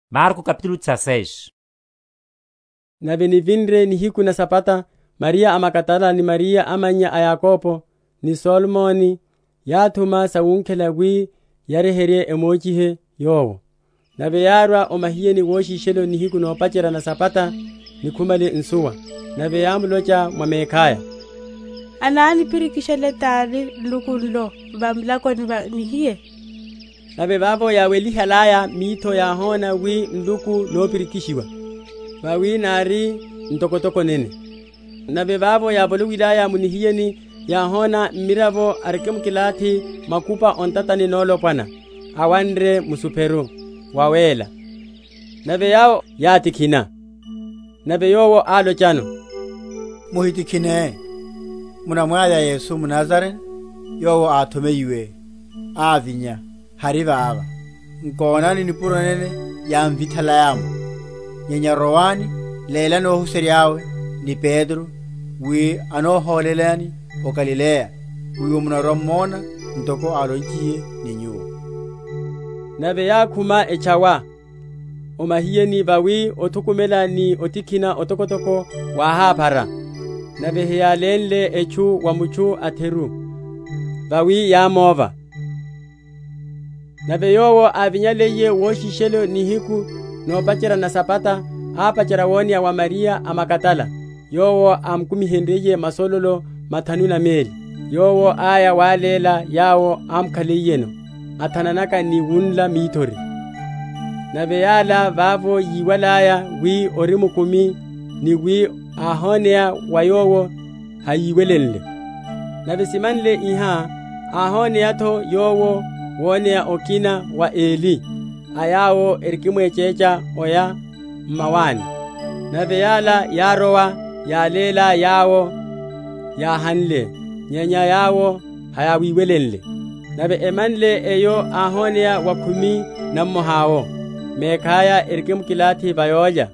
Ovinya’tho wa Yesu. Nave nivinre nihiku na Sabata, Mariya a Magadala ni Mariya amannya a Yakobo, ni Salome, yáthuma sawunkhela wi yahirwe‐emochihe Yowo. Nave yárwa o mahiyeni woshishelo nihiku nopacherya na Sabata, nikhumale nsuwa. Nave yámulocha mwa mekhaya, Ananipirikishele tani nluku nlo va milakoni va nihiye? Nave vavo yáwelihalaya mitho, yáhona wi nluku nopirikishiwa, vawi nári ntokotoko nene. Nave vavo yávolowilaya mu nihiyeni, yáhona mmiravo arikimkilathi makupa o ntatani nolopwana, awanre musopero wawéla; nave yawo yátikhina. Nave yowo álochano, Muhitikhine; munamwavya Yesu mNazarene Yowo áthomeyiwe; ávinya; hari vava; nkonani nipuro nene yámvithalaya’mo! Nyenya rowani, lélani óhuserya’we, ni Petro, wi anóhólelani o Galileya; wiwo munarwa‐m’mona ntoko álonchiye ni nyuwo. Nave yákhuma, etchawa o mahiyeni, vawi othukumela ni otikhina otokotoko wáháphara; nave heyálenle etchu wa mutchu a’theru; vawi yámóva. Woneya wa Yesu. Nave Yowo ávinyaliye woshishelo nihiku nopacherya na Sabata, ápacherya woneya wa Mariya a Magadala, yowo ámukumihenryiye masololo mathanu na meli. Yowo áya wáléla yawo ámukhaliyeno, athananaka ni wunla mithori. Nave yala vavo yíwalaya wi ori mukumi ni wi áhoneya wa yowo, hayíwelenle. Nave simanle iha, áhoneya’tho Yowo woneya okina wa eli a yawo erikimwechecha oya m’mawani. Nave yala yárowa, yáléla yawo yáhanle; nyenya yawo hayáwiwelenle. Nave emanle eyo, áhoneya wa khumi na mmoha’wo mekhaya, erikimkilathi va yólya;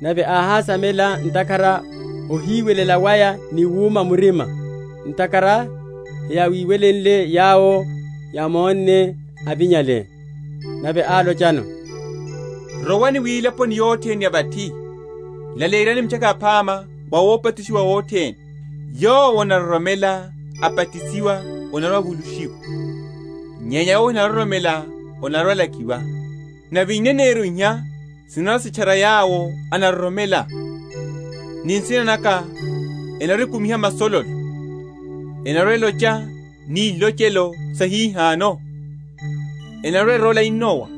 nave áhásamela ntakhara ohiwelela waya ni wuma murima, ntakhara hayíwelenle yawo yámonne, avinyale. Nave álochano, Rowani wilaponi yothene ya vathi, laleyeryani Mitchaka Yaphama wa ópachushiwa othene. Yowo anaroromela, abatisiwa, anarwa‐avulushiwa; nyenya yowo ahinaroromela anarwa‐alakiwa. Nave ineneryo iha sinarwa‐sitchara yawo enaroromela; ni nsina naka enarwa‐ekumiha masololo; enarwa‐elocha ni ilochelo sa hihano; enarwa‐erola inowa,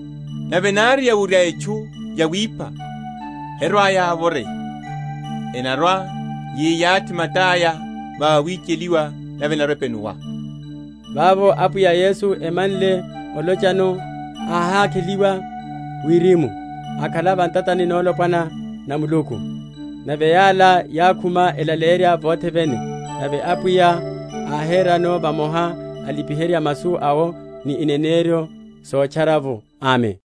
nave nari yawurya etchu yawipha, herwa‐yavoreya; enarwa‐yiyathi mata’ya va awicheliwa, nave enarwa‐epenuwa. Vavo Apwiya Yesu, amanle olochano, áhakheliwa wirimu, akhala va ntatani nolopwana na Muluku. Nave yala yákhuma, elaleyerya vothe vene, nave Apwiya áherano vamoha, alipiherya masu awo ni ineneryo sotchara’vo. Amen.